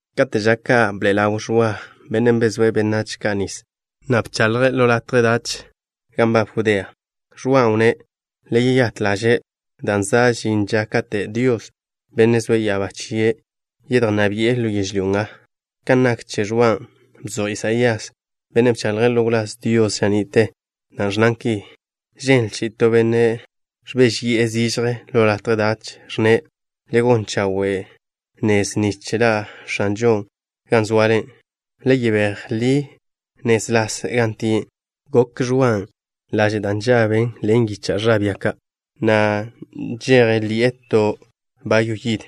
Kate' ža ka' bḻa' ḻaw Ẕwa, bennen' bezóe' benách ka' nis, na' bchaḻje' ḻo latje dach gan nbab Judea. Ẕwan' wnné': —Le yeyát ḻaže', dan' za' žin ža kate' Dios, Bennen' zoe' ya'abá chie', yedjnná bi'e ḻo yežlyó nga. Kan nak che Ẕwan', bzoj Isaías, bennen' bchaḻje' ḻo wláz Dios ža ni'te, da' ẕnnan ki: Ženl chi'i to benne' ẕbéžeyi'e zižje ḻo latje dach, ẕnne': “Le gon chawe' nez nich ḻa' X̱anžon' gan zoale. Le yebéj ḻi nez ḻas gan tie'.” Gokw Ẕwan' laže' da' nžaben ḻen yicha' bia ka', na' nžeje ḻi'e to bayw yid.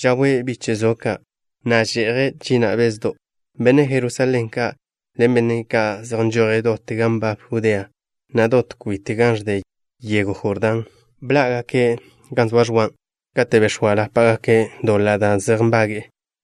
Žawe' biche' zo ka', na' že'je' china' bezdo'. Benne' Jerusalén ka' ḻen benne' ka' zej nžoje' dot gan nbab Judea, na' dot kwit gan ẕde yego Jordán, bḻá'gake' gan zoa Ẕwan'. Kate' bex̱óalapagake' doḻa' da' zej nbage'e,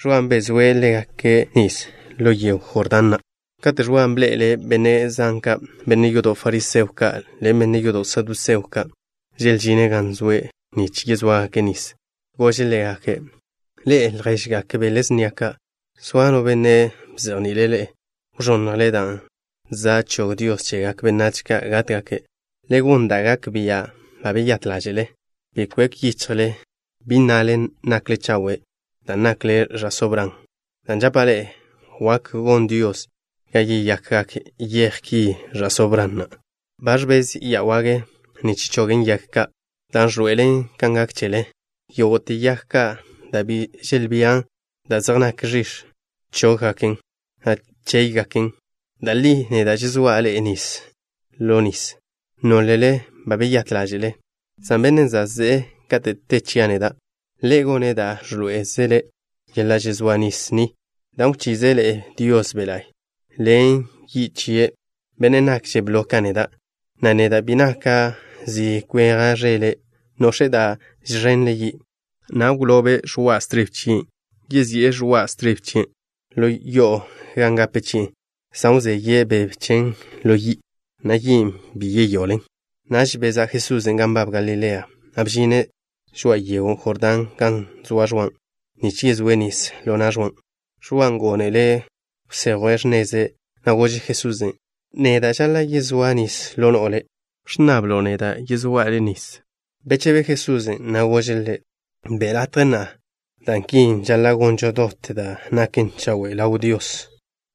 Ẕwan' bezóe' ḻégake' nis ḻo yego Jordán na'. Kate' Ẕwan' bḻe'ele' benne' zan ka', benne' yodo' fariseo ka' ḻen benne' yodo' saduseo ka', želžine' gan zoe' nich yezóagake' nis, gože' ḻégake': —Ḻe'e, lježgak bele snia ka'. ¿Zoa no benne' bzejni'ile' ḻe'e wẕonnjle dan' za' chog Dios chegak benách ka' gátgake'? Le gon da' gak bia' ba beyát ḻáže'le. Bi kwek yichjle, bi nnale nakle chawe' dan' nakle ẕa'só Bran, dan' žapa' ḻe'e, wak gon Dios ga yeyakgak yej ki ẕa'só Bran na'. Ba ẕbez ya wage nich chogen yag ka', dan' ẕḻoe'elen kan gak chele. Yógo'te yag ka' da' bi želbían da' zej naken ẕix̱, chóggaken, na' chéygaken. Da' li neda' žezóa' ḻe'e nis ḻo nis, nólele ba beyát ḻáže'le, san Bennen' za' ze'e kate' te chia' neda', Ḻe' gone' da' ẕḻoé'ezele yeḻa' žezóa nis ni, dan' wchize' ḻe'e Dios Be' La'y, ḻen yi' chie'. Bennen' nakže' blo ka neda', na' neda' bi naka' zi kweja' ẕele'. Nox̱e' da' žẕenle' yi', na' wlobe' ẕoa' stribe chie'. Yezi'e ẕoa' stribe chien' ḻo yo'o gan gape chi'en, san wzeye' beb chen ḻo yi', na' yin' bi yeyoḻen. Naž bezá' Jesusen' gan nbab Galilea, na' bžine' žoa'a yego Jordán gan zoa Ẕwa, nich yezóe' nis ḻo na' Ẕwan'. Ẕwan' gónele' wsejwe' x̱neze', na' gože' Jesusen': —Neda' žaḻa' yezóa' nis ḻo no'o Le'. ¿Ẕnnabkzlo' neda' yezóa' Le' nis? Bechebe Jesusen', na' gože' ḻe': —Be' latje na'a, dan' ki žaḻa' gonžo dot da' naken chawe' ḻaw Dios.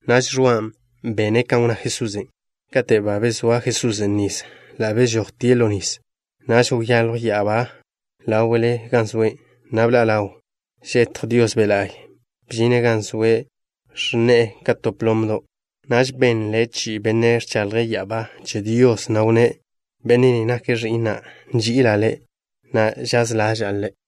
Naž Ẕwan' bene' kan wnná Jesusen'. Kate' ba bezóa Jesusen' nis, ḻa' bežojtie' ḻo nis. Naž wyaljw ya'abá ḻáwe'le gan zoe', na' bḻa' ḻaw žetj Dios Be' La'y. Bžine' gan zoe', ẕnne'e ka to plomdo'. Naž benle chi'i Benne' ẕchaḻje' ya'abá che Dios, na' wnné': —Benne' ni nake' Ẕi'na'. Nži'ila' Ḻe', na' žaz ḻaža'a Ḻe'.